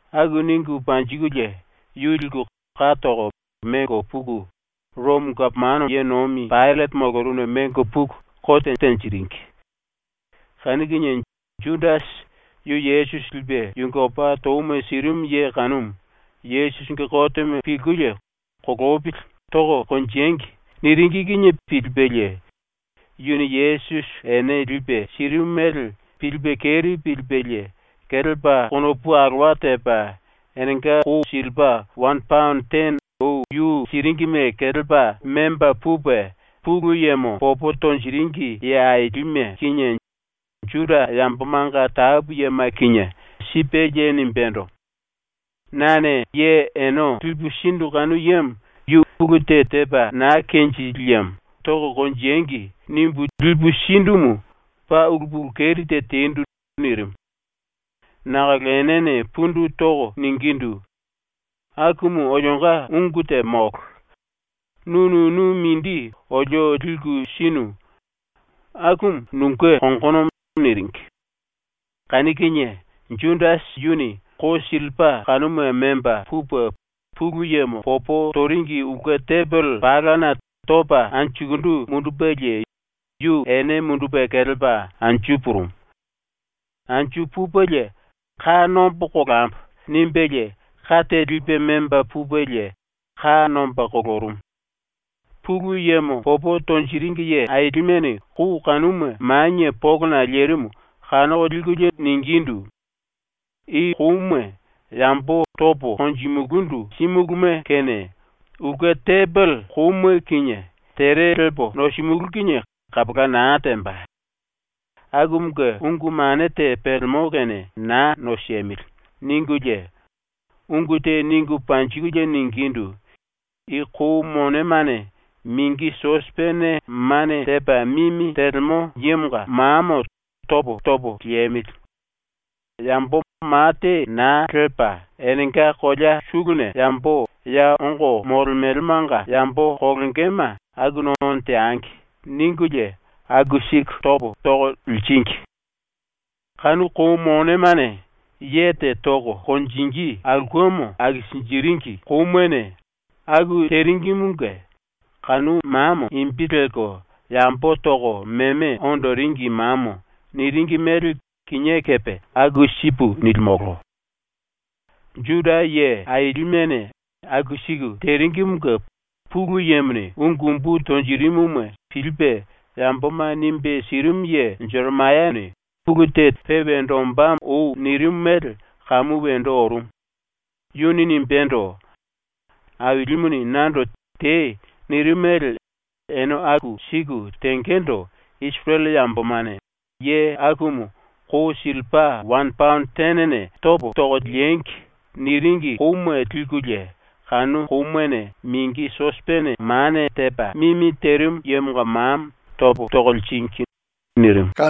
Aku ningu panjikulie yu liku, ka toko, mengo puku, ⸤Romo⸥ gapomano ye nomi Paillate molorumuna mengo puku kote tenjiringi. Kanu kinie Judasi, yu Yesusi lipe yunge opa touma sirimu ye kanumu, Yesusinge kotemo pilkulie “Kolopili, toko konjengi.” niringi kinie pilipelie yuni Yesusi ene lipe sirimu mele pilipe keri pilipelie kelepa konopu alowa tepa enenga kou sillipa wane paono tene ou yu siringime kelepa memba pupe Pulu Yemo popo tonjiringi ye ailime kinie Juda yambomanga tapu yema kinie sipelie nimbendo: “Nane ye ene lipu sindu kanu yemo yu ulu te tepa na kenjili yemo ‘Toko konjengi.’ nimbu lipu sindumu paa ulu pulu keri te tendu.” nirimu. Nakolo enene pundu toko ningindu: “Akumu olionga ungu te molo. ⸤Nu nunu mindi olio liku sinu.⸥ Akumu nunge kongonomo.” niringi. Kanu kinie Judasi yuni kou sillipa kanuma memba pupe ⸤Pulu Yemo popo toringi⸥ ulke tembele palana topa anjukundu mundupelie yu ene mundupe kelepa anju purumu. Anju pupelie ‘Ka nombo kolambo.’ nimbelie ka te lipe memba pupelie ka nomba kolorumu. Pulu Yemo popo tonjiringi ye ailimene kou kanuma ⸤manie polona⸥ lerimu kanoko likulie ningindu: “I kouma yambo topo konjimulundu símuluma kene ulke tembele kouma kinie tere lepo nosimulú kinie kapola na temba. Akumunge ungu mane te pelemo kene na nosemili.” ningulie ungu te ningu panjikulie ningindu: “I kou monemane mingi sosipene mane tepa mimi telemo yemonga mamo topo topo liemili. Yambo ma te na lepa enenga kolea suluna yambo ya ongo molemelemanga yambo kolongema akuna ono teangi.” ningulie aku siku topo toko liringi. ⸤Kanu kou monemane ye te toko konjingí aulkemo akisinjiringi koumane⸥ aku teringimunge kanu mamo imbi lelko ‘Yambo Toko Meme Ondoringi Mamo’ niringi mele kinié kepe aku sipu nilimolo. ⸤Juda ye ailimene⸥ aku siku teringimunge Pulu Yemone ungu umbu tonjirimuma pilipe yamboma nimbe sirimu ye Jeremayane ulu te pe wendo ombá ou nirimu mele kamu wendo orumu. Yuni nimbendo: “Ailimuni nando “Tei.” nirimu mele ene aku siku tengendo Isirele yambomane “Ye akumu kou sillipa wane paono tenene topo toko liengi.” niringi kouma likulie, kanu koumane mingi sosipene mane tepa mimi terimu yemonga mamo topo toko liringi.” nirimu.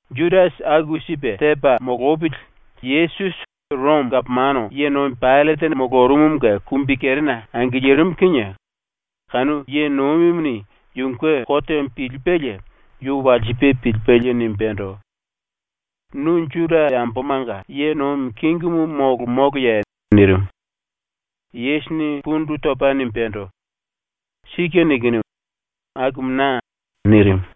Judasi aku sipe tepa molopili Yesusi Romo gapomano ye nomi ⸤Paillate⸥ molorumumunge kumbikerena angilirimu kinie kanu ye nomimuni ⸤yunge kotemo pilipelie⸥ yu walsipe pilipelie nimbendo: “Nu Juda yambomanga ye nomi kingimu molo moloye?” nirimu. Yesusini pundu topa nimbendo: “Sike nikinu. Akumu na.” nirimu.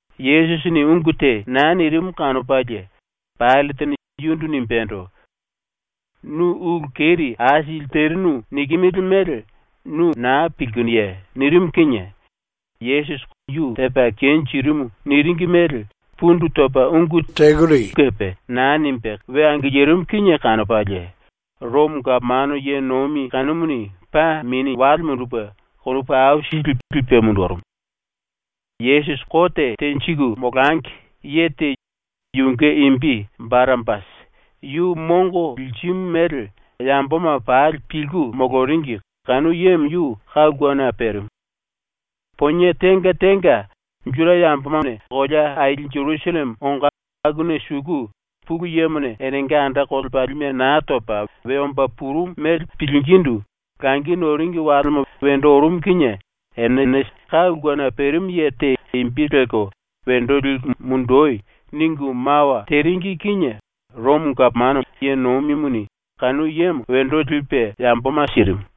⸤Yesusini ungu te na nirimu kanopalie⸥ Paillatene yundu nimbendo: “Nu ulu keri aisili terinu nikimili mele nu na pilkinuye?” nirimu kinie Yesusi ⸤yu tepa kenjirimu niringi mele⸥ pundu topa ungu telu kepe na nimbe ⸤karaye na tepa we angilirimu kinie kanopalie Romo⸥ gapomano ye nomi kanumuni paa mini wale mundupe konopu aisili lipe mundurumu. ⸤Yesusi kote tenjiku molangi,⸥ ye te, yunge imbi Barapasi, yu mongo lirimu mele yamboma pali pilku moloringi kanu yemo yu ka ulkena perimu. ⸤Ponie tenga tenga, Juda yambomane kolea aili Jerusalleme ongo akuna suku⸥ Pulu Yemone enenga anda kolepalime Naa Topa We Omba Purumu mele pilingindu langi noringi walema wendo orumu kinie enene ka ulkena perimu ye te imbi lelko “Wendo liku mundoi.” ningu mawa teringi kinie ⸤Romo⸥ gapomano ye nomimuni kanu yemo wendo lipe yamboma sirimu.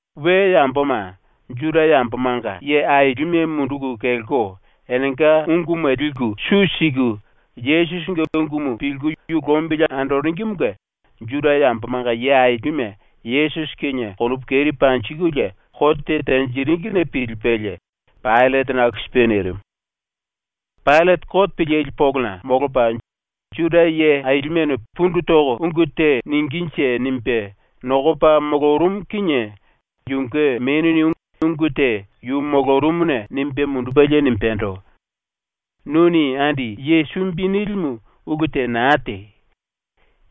⸤We yamboma Juda yambomanga ye ailime munduku kelko enenga unguma liku su siku Yesusinge ungumu pilku yu lombili andoringimunge Juda yambomanga ye ailime⸥ Yesusi kinie konopu keri panjikulie kote tenjiringine pilipelie Paillatene aku sipe nirimu. Paillate kote pilili polona ⸤molopa ‘Juda ye ailimene pundu toko ungu te ningínje.’ nimbe nokopa⸥ molorumu kinie yunge menuni ungu te yu molorumuna nimbe mundupelie nimbendo: “Nuni andi ye sumbi nilimu ulu te na tei.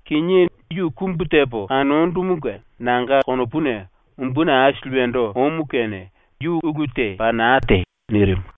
Kinié yu kumbu tepo kanondumunge nanga konopuna umbuni aisili wendo omu kene yu ulu te paa na tei.” nirimu.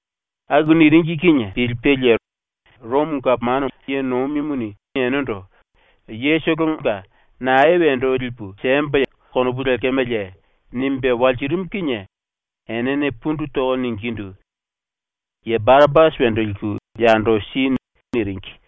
⸤Aku niringi kinie pilipelie Romo⸥ gapomano ye nomimuni enendo “yetolonga ‘nae wendo lipu siembo.’ konopu lekemeleye?” nimbe walsirimu kinie enene pundu toko ningindu: “Ye Barapasi ⸤wendo liku yando si.⸥” niringi.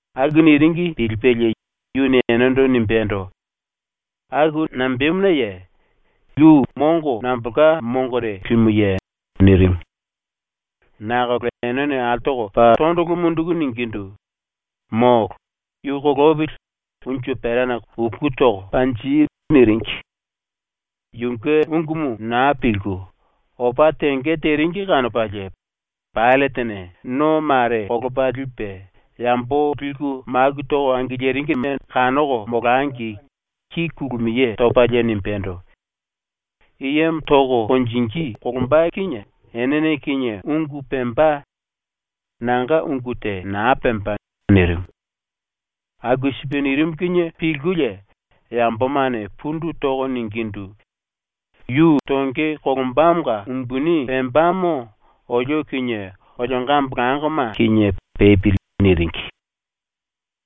Aku niringi pilipelie yuni enendo nimbendo: “Aku nambemunaye? Yu mongo nambolka mongore limuye?” nirimu. Nakolo enene ⸤altoko⸥ paa tondolo munduku ningindu: “Molo! Yu kolopili, unju perana uku toko panji!” niringi. Yunge ungumu na pilku, opa tenge teringi kanopalie Paillatene no mare kolopa lipe, yambo liku maku toko angiliringime kanoko molangi ki kulumiye topalie nimbendo: “I yemo toko konjingí kolomba kinie ene kinie ungu pemba; nanga ungu te na pemba.” nirimu. ⸤Aku sipe nirimu kinie pilkulie⸥ yambomane pundu toko ningindu: “Yu tonge kolombamonga umbuni pembamo olio kinie olionga ambolangoma kinie pepili.” niringi.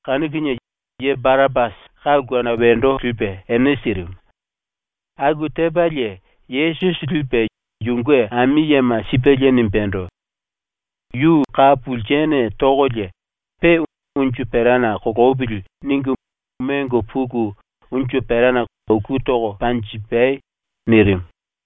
Kanu kinie ye Barapasi ka ulkena wendo lipe ene sirimu. ⸤Aku tepalie⸥ Yesusi lipe ⸤yunge ami yema⸥ sipelie nimbendo: “Yu ka pulsene tokolie pe ‘Unju perana kolopili.’ ningu mengo puku unju perana uku toko panjipai.” nirimu.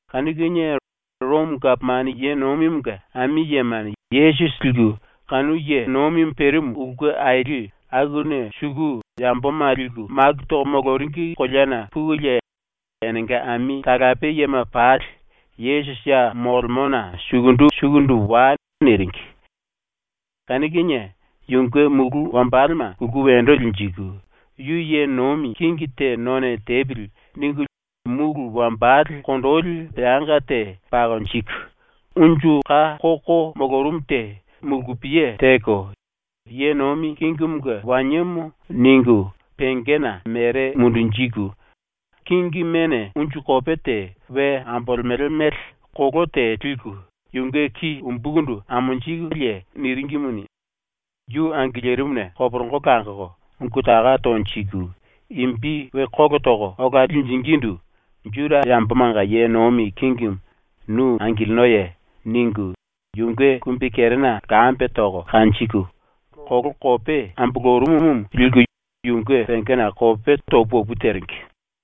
Kanu kinie ⸤Romo⸥ gapomano ye nomimunge ami yemane Yesusi liku kanu ye nomimu perimu ulke aili akuna suku ⸤yamboma liku maku toko moloringi koleana⸥ pukulie, enenga ami talape yema pali “⸤Yesusi ya molemona⸥ sukundu sukundu wai.” niringi. Kanu kinie yunge mulu wambalema kulku wendo linjiku, ‘Yu ye nomi kingi te none tepili.’ ningu mulu wambale kondoli peanga te pakonjiku, unju ka koko molorumu te mulkupiye teko ‘Ye nomi kingimunge waniemo.’ ningu pengena mere mundunjiku, kingimene unju kope te we ambolemele mele koló te liku yunge ki umbukundu amonjikulie niringimuni, yu angilirimuna koporongo langoko ungu taka tonjiku imbi we kólo toko ola linjingindu “Juda yambomanga ye nomi kingimu, nu angilinoye?” ningu yunge kumbikerena lkambe toko kanjiku, koló kope ambolorumumu liku yunge pengena kope to pu opu teringi.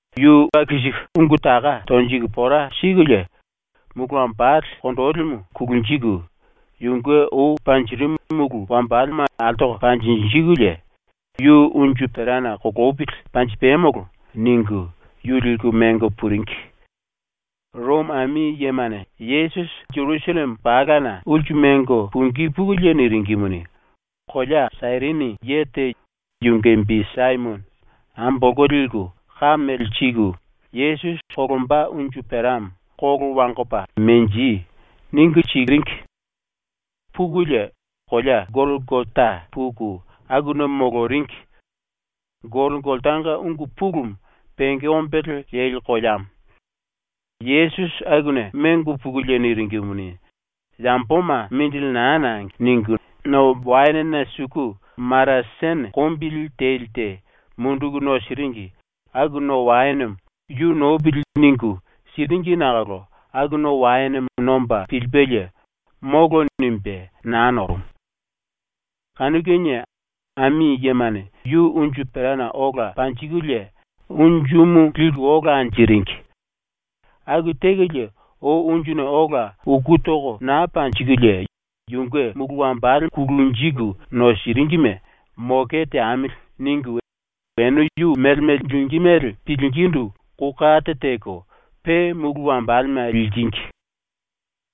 Yu aku siku ungu taka tonjiku pora sikulie mulu wambale kondolimu kulunjiku, yunge ou panjirimu mulu wambalema altoko panjinjikulie “Yu unju perana kolopili, panjipamolo.” ningu yu liku mengo puringi. ⸤Romo ami yemane Yesusi Jerusalleme palana⸥ ulsu mengo pungí pukulie niringimuni, kolea Sairini ye te, yunge imbi Saimono, ambolko liku ka mele siku Yesusi kolomba unju peramo “Kolo wangoko menji.” ningu siringi. ⸤Pukulie⸥ kolea Golkota puku akuna moloringi. (Golkotanga ungu pulumu ‘penge ombele leli koleamo’.) ⸤Yesusi akuna mengo pukulie niringimuni, ‘Yamboma mindili na nangi.’ ningu⸥ no waenena suku maratene kombili teli te munduku nosiringi aku no waenemo ‘Yu nopili.’ ningu, siringi nakolo aku no waenemo nomba pilipelie “Molo.” nimbe na norumu. Kanu kinie ⸤ami yemane⸥ yu unju perana ola panjikulie unjumu liku ola anjiringi. ⸤Aku tekolie, ou unjuna ola uku toko na panjikulie⸥ yunge mulu wambale ⸤kulunjiku nosiringime⸥ ‘Moke teamili.’ ningu ene yu mele mele lingí mele pilingindu kou kate teko pe mulu wambalema liringi.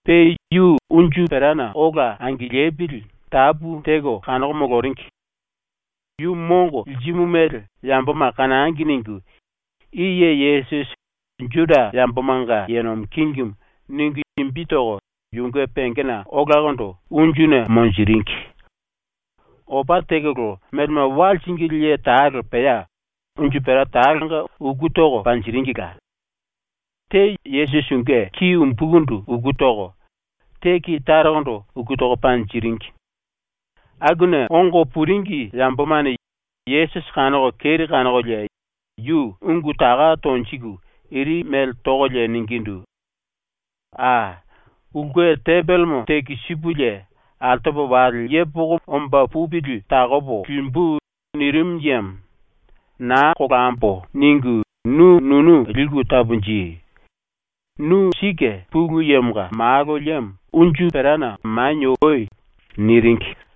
Pe yu unju perana ola angilipili tapu teko kanoko moloringi. ‘Yu mongo lirimu mele yamboma kanangi.’ ningu I YE YESUSI JUDA YAMBOMANGA YE NOMI KINGIMU ningu imbi toko yunge pengena olakondo unjuna monjiringi. Opa tekolo melema wa liringili ye talo pea unju pera talonga uku toko panjiringila. Te Yesusi yunge ki umbukundu uku toko, te ki tarokondo uku toko panjiringi. Akuna ongo puringi yambomane Yesusi ⸤kanoko keri kanokolie yu⸥ ungu taka tonjiku iri mele tokolie ningindu: “Aa! “Ulke tembelemo tekisipulie altopo wale yepoko omba pupili takopo limbu.” nirinu yemo, ‘Naa kolambo.’ ningu nu nunu liku taponji. Nu sike Pulu Yemonga Malo liemo unju perana manie oi.” niringi.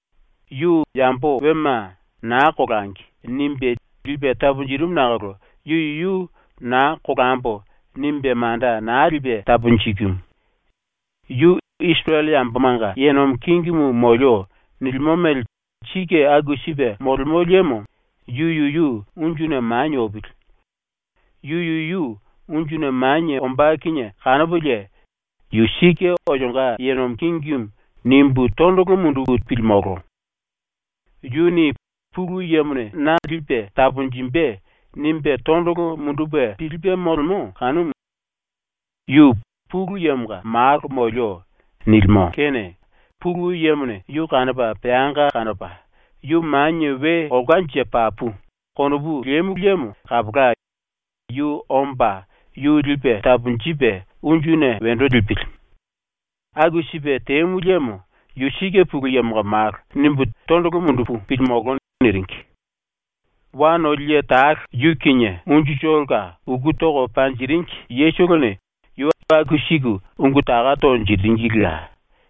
“Yu yambo wema ‘Naa kolangi.’ nimbe lipe taponjirimu nakolo yu yuyu ‘Naa kolambo.’ nimbe manda na lipe taponjikimu. Yu ‘Isirele yambomanga ye nomi kingimu ⸤molio.’ nilimo mele sike aku sipe⸥ molemo liemo yu yuyu unjuna manie opili. Yu yuyu unjuna manie ombá kinie kanopolie ‘Yu sike olionga ye nomi kingimu.’ nimbu tondolo mundupu pilimolo. Yuni ‘Pulu Yemone na lipe taponjimbe.’ nimbe tondolo mundupe pilipe molemo kanumu; yu “Pulu Yemonga Malo molio.” nilimo kene Pulu Yemone yu kanopa peanga kanopa, ‘Yu manie we olkanje papu.’ konopu lemu liemo kapola, yu omba yu lipe taponjipe ⸤unjuna wendo lipili⸥. ⸤Aku sipe temu liemo ‘Yu sike Pulu Yemonga Malo.’ nimbu tondolo mundupu pilimolo⸥.” niringi. Wa noli ye talo yu kinie unjutolonga uku toko panjiringi yetolone yu aku siku ungu taka tonjiringilila.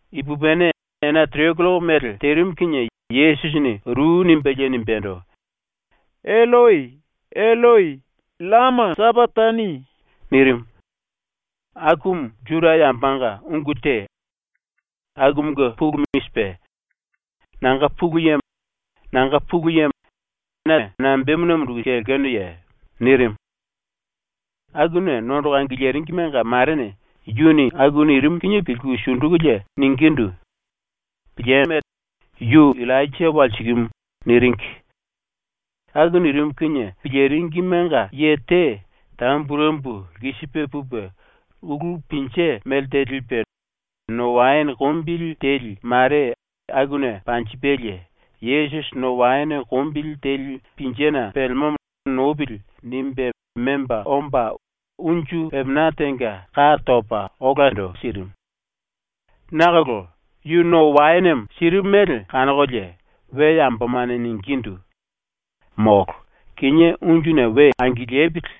Ipupini ena tere killoko mele terimu kinie Yesusini ru nimbelie nimbendo: “Elloi, Elloi, llama sapakatani.” nirimu. Akumu Juda yambomanga ungu te. Akumunge pulumu i sipe: “Nanga Pulu Yemo, nanga Pulu Yemo, na nambemuna munduku kelenuye?” nirimu. Akuna nondoko angiliringimenga marene yuni aku nirimu kinie pilku ⸤sundukulie⸥ ningindu: “Pilieme. Yu Illainja walsikimu.” niringi. Aku nirimu kinie piliringimenga ye te tamburembu lkisipe pupe ulú pinje mele te lipe no waene kombili teli mare akuna panjipelie, ‘Yesusi no waene kombili teli pinjena pelemomo nopili.’ nimbe memba omba unju pepena tenga ka topa olando sirimu. ⸤Nakolo yu no waenemo sirimu mele kanokolie⸥ we yambomane ningindu: “Molo. Kinié unjuna we angilipili.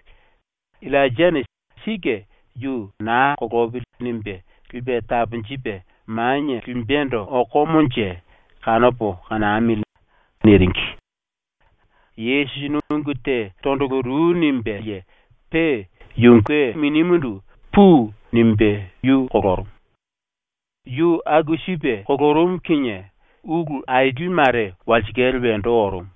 Illainjane sike yu ‘Naa kolopili.’ nimbe lipe taponjipe manie limbendo okomonje, kanopo kanamili.” niringi. Yesusini ungu te tondolo ru nimbelie, pe yunge minimundu ‘Pui.’ nimbe yu kolorumu. Yu aku sipe kolorumu kinie ⸤ulu aili mare⸥ walsikale ⸤wendo orumu.⸥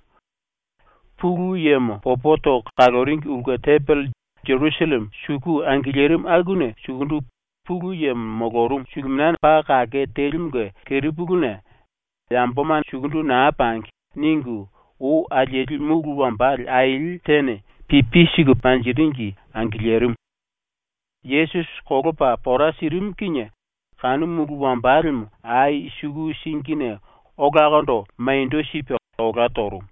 Pulu Yemo popo toko kaloringi ulke tembele ⸤Jerusalleme suku angilirimu akuna sukundu Pulu Yemo molorumu⸥ suluminia paa kake telimunge kerepuluna ⸤‘Yamboma sukundu na pangi.’ ningu ou alieli⸥ mulu wambale aili tene pipi siku panjiringi angilirimu. ⸤Yesusi kolopa pora sirimu kinie⸥ kanu mulu wambalemo ai suku singine olakondo maniendo sipe olá torumu.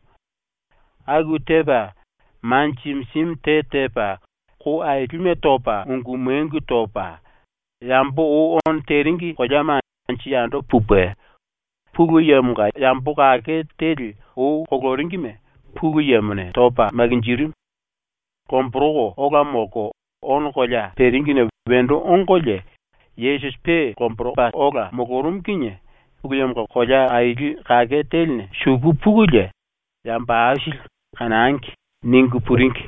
⸤Aku tepa,⸥ ma jimi jimi te tepa, kou ailime topa ungu mengu topa, yambo ou ono teringi koleama anju yando pupe, Pulu Yemonga yambo kake teli ou koloringime ⸤Pulu Yemone⸥ topa makinjirimu. Lomboroko ola molko ono kolea peringine wendo ongolie, Yesusi pe lomboropa ola molorumu kinie Pulu Yemonga kolea aili kake teline suku pukulie yambo aisili ‘Kanangi.’ ningu puringi.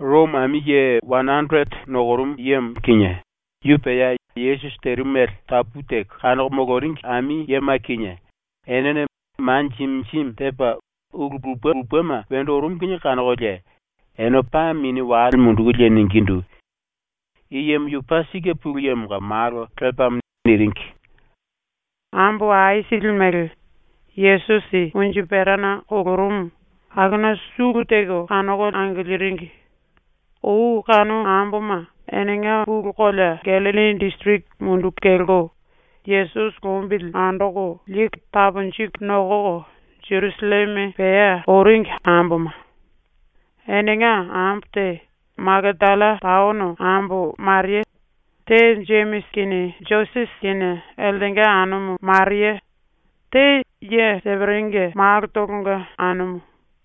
⸤Romo⸥ ami ye wane anderete nokorumu yemo kinie, yu pea Yesusi terimu mele tapu teko kanoko moloringi ami yema kinie, enene ma jimi jimi tepa ulu lupe lupema wendo orumu kinie kanokolie ene paa mini wale mundukulie ningindu: “I yemo yu paa sike Pulu Yemonga Malo lepamo.” niringi. Ambo aisili mele, ⸤Yesusi unju perana kolorumu⸥ akuna sulu teko kanoko angiliringi. Ou kanu amboma ⸤enenga pulu⸥ kolea Gallilli disiriki munduku kelko Yesusi lombili andoko liku taponjiku nokoko ⸤Jerusalleme pea⸥ oringi amboma. Enenga ambo te Makatalla taono ambo Maria, te Jemisi kinie Josese kinie eltenga anumu Maria, te ye Seperinge malotolonga anumu.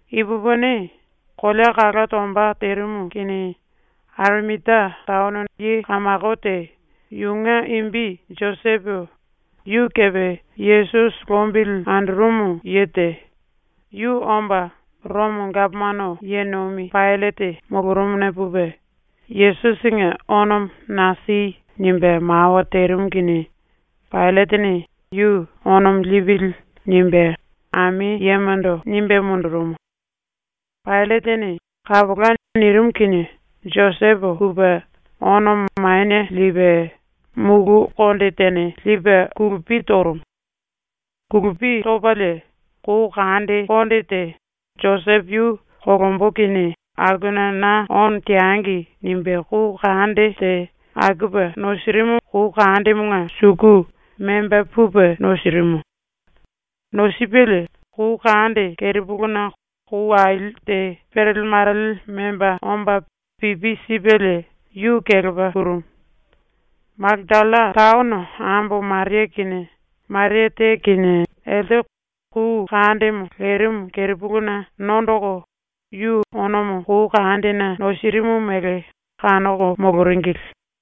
Ipupini, kolea kala tomba terimu kinie Arimatia taono ye kamako te, yunge imbi Josepo, yu kepe Yesusi lombili andorumu ye te, yu omba ⸤Romo gapomano ye nomi⸥ Paillate molorumuna pupe, “Yesusinge onomo na si.” nimbe mawa terimu kinie Paillatene yu “Onomo lipili.” nimbe ⸤ami yemando nimbe mundurumu⸥. ⸤Paillatene “Kapola.” nirimu kinie⸥ Josepo pupe onomo manie lipe, mulu konde tene lipe kulupi torumu. Kulupi topalie kou kande konde te, Josepo yu ‘Kolombo kinie akuna na ono teangi.’ nimbe kou kande te akupe nosirimu kou kandemonga suku memba pupe nosirimu. Nosipelie kou kande kerepuluna kou aili te perele marele memba omba pipi sipelie yu kelepa purumu. Makatalla taono ambo Maria kinie Maria te kinie elte kou kandemo lerimu kerepuluna nondoko ⸤yu onomo kou kandena nosirimu mele kanoko⸥ moloringili.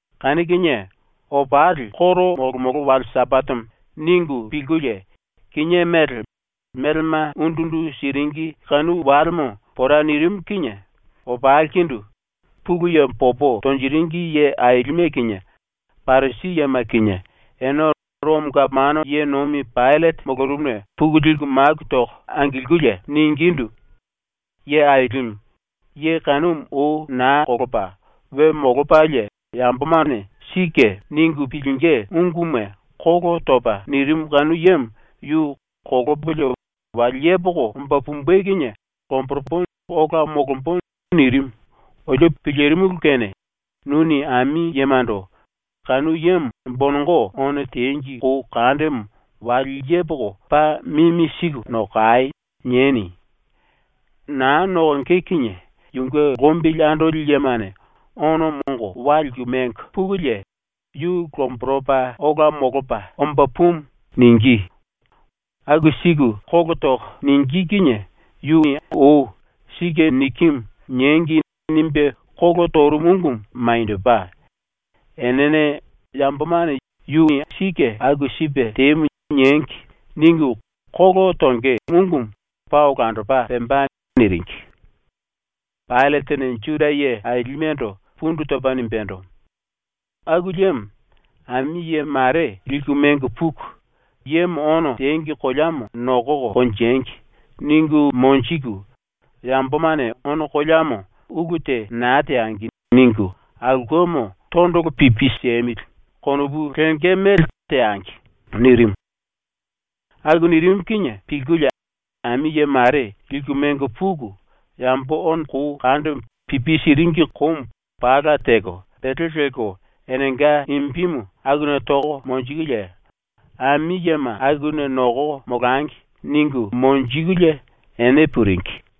⸤Kanu kinie,⸥ ‘Opali ⸤koro molomolo wale⸥ Sambatemo.’ ningu pilkulie, kinié mele, melema undu undu siringi kanu walemo pora nirimu kinie opalikundu Pulu Yemo popo tonjiringi ye ailime kinie, Parisi yema kinie, ene ⸤Romo gapomano ye nomi⸥ Paillate molorumuna puku liku maku toko angilkulie ningindu: “Ye Ailimu, ye kanumu ou na kolopa we molopalie yambomane ‘Sike.’ ningu pilingí unguma kolo topa nirimu kanu yemo yu “Kolopolie wale yepoko omba pumbe kinie lomboropo ola molombo.” nirimu olio pilirimulu kene ⸤nuni ami yemando⸥ “Kanu yemo ⸤bonongo⸥ ono tengi kou kandemo wale yepoko paa mimi siku nokai!” nieni. Naa nokonge kinie yunge lombili andoli yemane onomo ongo wa liku mengo pukulie “Yu lomboropa ola molopa omba pumu.” ningí. Aku siku kolo toko ningí kinie yu ou ‘ ‘Sike nikimu.’ niengi.’ nimbe kolo torumu ungumu maniendopa, enene ‘Yambomane ‘Yuni sike aku sipe temu.’ niengi.’ ningu kolo tonge ungumu paa olandopa pemba.” niringi. Paillatene ⸤Juda ye ailimendo⸥ pundu topa nimbendo: “⸤Aku liemo,⸥ ami ye mare liku mengo puku, “Yemo ono tengi koleamo nokoko konjengi.” ningu monjiku, ‘Yambomane ono koleamo ulu te na teangi.’ ningu ‘Aulkemo tondolo pipi siemili.’ konopu lenge mele teangi.” nirimu. ⸤Aku nirimu kinie⸥ pilkulie ami ye mare liku mengo puku, yambo ono kou kandemo pipi siringi koumu pala teko pele lelko enenga imbimu akuna toko monjikulie, “Ami yema akuna nokoko molangi.” ningu monjikulie ⸤ene puringi⸥.